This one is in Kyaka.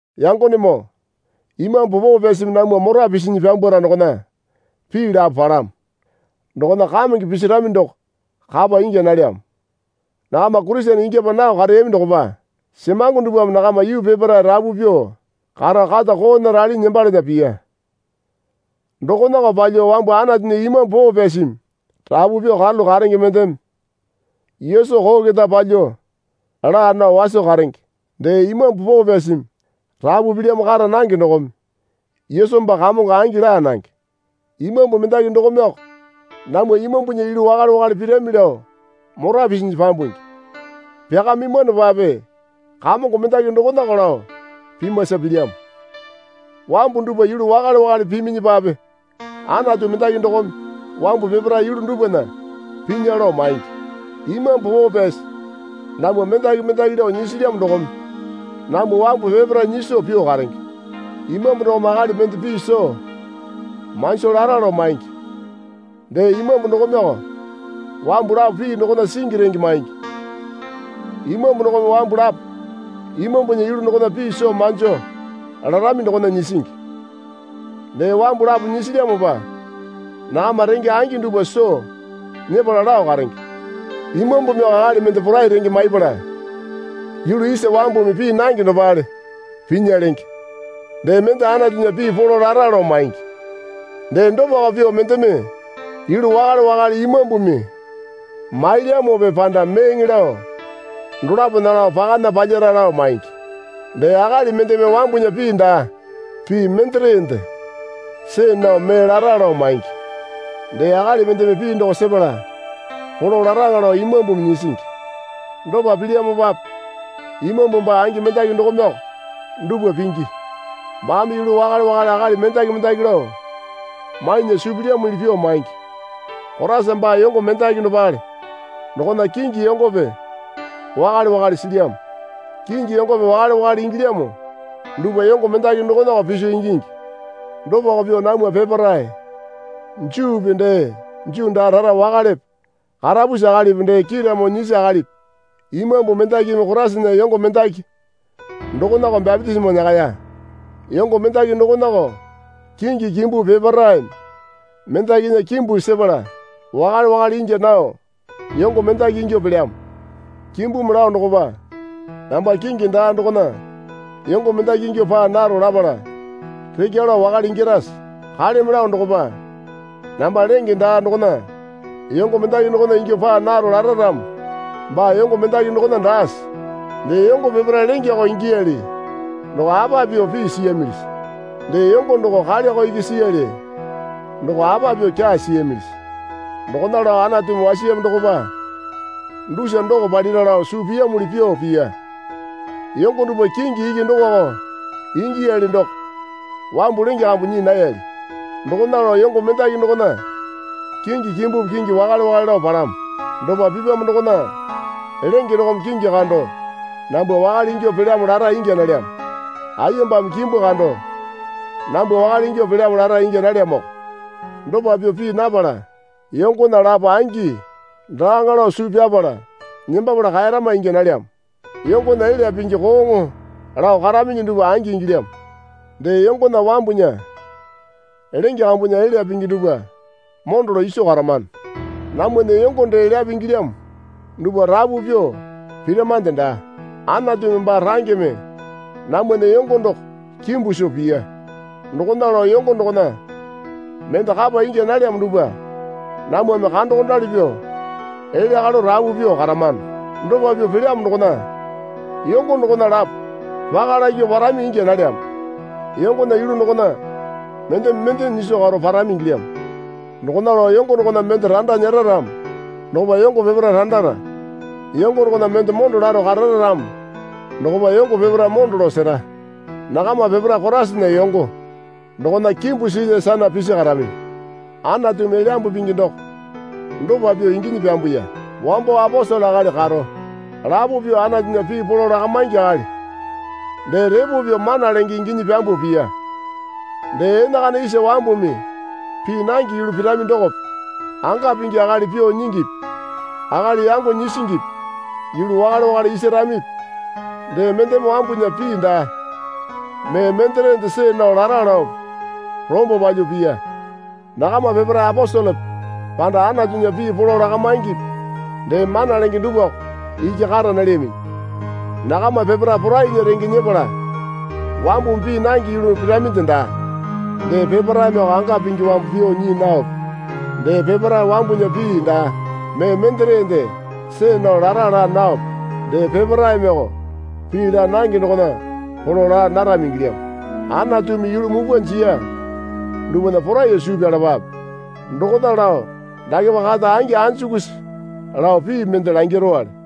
Yangonemoo Imambu Poo Pyasimi namwa mora pisinyi pyambwara dokona pii lapo palamo. Dokona kamenge pisirami doko kapa ingya nalyamo. Nakama Kurisene ingyapa nao kareyami dokopa semango dupwame nakama yuu peparae rapu pyuo karo kata koona ralinyi nembalana piya. Dokonako palyuo wambu Anatunya Imambu Poo Pyasimi rapu pyuo karalu karenge mendeme, Yesu koo keta palyuo laa nao waso karenge. Dee Imambu Poo Pyasimi rapu pilyamo kara nange dokome, Yesu baa Kamongo angi laa nange. Imambu mendaki dokomeko namwa imambunya yulu wakale wakale pirami lao mora pisinyi pyambungi. Pyakamimwanopape Kamongo mendaki dokonako lao pimasa pilyamo. Wambu dupwa yulu wakale wakale piminyipape Anatu mendaki dokome wambu peparae yulu dupwana pinya lao maingi. Imambu Poo Pyasi namwa mendaki mendaki lao nyisilyamo dokome namwa wambu peparae nyiso pyuo karenge. Imambu dokome akali mende pii soo manjo lara lao maingi. Dee Imambu dokomeko wambu lapo pii dokona singi renge maingi. Imambu dokome wambu lapo Imambunya yulu dokona pii soo manjo larami dokona nyisingi. Dee wambu lapo nyisilyamopa nakama renge angi dupwa soo nyepala lao karenge. Imambumiko akali mende porai renge maipala yulu isa wambumi pii nange dopale pinya lenge. Dee mende Anatunya pii polo lara lao maingi. Dee dopako pyuo mendeme yulu wakale wakale Imambumi mailyamope panda meeŋe lao dolapona lao pakana palyara lao maingi. Dee akali mendeme wambunya pii daa pii menderende see nao mee lara lao maingi. Dee akali mendeme pii doko sepala polo laraŋa lao Imambumi nyisingi. Dopa pilyamopape Imambu baa angi mendaki dokomeko dupwa pingi. Baame yulu wakale wakale akali mendaki mendaki lao mainya suu pilyamuli pyuo maingi. Koraisa baa yongo mendaki dopale. Dokona kingi yongope wakale wakale silyamo. Kingi yongope wakale wakale ingilyamo dupwa yongo mendaki dokonako piso ingingi. Dopako pyuo namwa peparae Juupi dee Juu daa rara wakalepe karapusi akalipi dee kiiramo nyisi akalipi Imambu mendakimi Koraisana yongo mendaki dokonako bapitisimo nyakaya. Yongo mendaki dokonako kingi kimbupi peparaeme mendakinya kimbu sepala wakale wakale ingya nao yongo mendaki ingyuo pelyamo. Kimbumi lao dokopa, Namba kingi daa dokona yongo mendaki ingyuo paa naro lapala rekya lao wakale ingyarase? Kaleme lao dokopa, Namba lenge daa dokona yongo mendaki dokona ingyuo paa naro lara ramo baa yongo mendaki dokona daase? Dee yongo peparae lengeko ingiyali doko apa pyuo pii siyamilisi? Dee yongo doko kaleko iki siyali doko apa pyuo kyaa siyamilisi? Dokona lao Anatumi wasiyamo dokopa dusa doko palyara lao suu piyamuli pyuo piya. Yongo dupwa kingi iki dokoko ingiyali doko wambu lenge kambu nyii nayali. Dokona lao yongo mendaki dokona kingi kimbupi kingi wakale wakale lao palamo. Dopa pipyamo dokona lenge dokome kingi kando, Nambwa wakale ingyuo pelyamo lara ingya nalyamo. Ayembame kimbu kando, Nambwa wakale ingyuo pelyamo lara ingya nalyamoko. Dopa pyuo pii napala yongona lapo angi daaŋa lao suu pyapala nembapala kaerama ingya nalyamo. Yongona elya pingi kooŋo lao karaminyi dupwa angi ingilyamo. Dee yongona wambunya lenge kambunya elya pingi dupwa mondo lao iso karamano. Namwana yongo dee elyape ingilyamo dupwa rapu pyuo piramande daa. Anatumi baa rangeme namwana yongo doko kimbu soo piya. Dokona lao yongo dokona mende kapa ingya nalyamo dupwa namwame kandokondali pyuo elya kalo rapu pyuo karamano. Dopa pyuo pelyamo dokona yongo dokona lapo paka lakyuo parami ingya nalyamo. Yongona yulu dokona mendeme mende nyiso karo parami ingilyamo. Dokona lao yongo dokona mende randa nyera ramo dokopa yongo peparae randara. Yongo dokona mende mondo laro karara ramo dokopa yongo peparae mondo lao sera. Nakama peparae Koraisana yongo. Dokona kimbu silya sana pisi karaminyi. Anatumi Elyambu Pingi doko dopa pyuo inginyi pyambuya. Wambo aposele akali karo, lapo pyuo Anatunya pii polo lakamaingi akali, dee repo pyuo mana lenge inginyi pyambuo piya. Dee enakana isa wambumi pii nange yulu pirami dokope anga pingi akali pyuo nyingipi akali yango nyisingipi yulu wakale wakale isaramipi dee mendeme wambunya pii daa mee menderende see nao lara laope rombo palyuo piya. Nakama peparae aposelepe panda Anatunya pii polo lakamaingipi dee mana lenge dupwako iki kara nalyaminyi. Nakama peparae porainya renge nyepala wambumi pii nange yulu piraminde daa. Dee peparaemeko anga pingi wambu pyuo nyii naope dee peparae wambunya pii daa mee menderende see nao lara laa naope dee peparaemeko pii laa nange dokona polo laa narami ingilyamo. Anatumi yulu mupwa jiya dupwana poraiyuo suu pyalapape. Dokona lao dakepa kata angi anjukusi lao pii mende langirowale.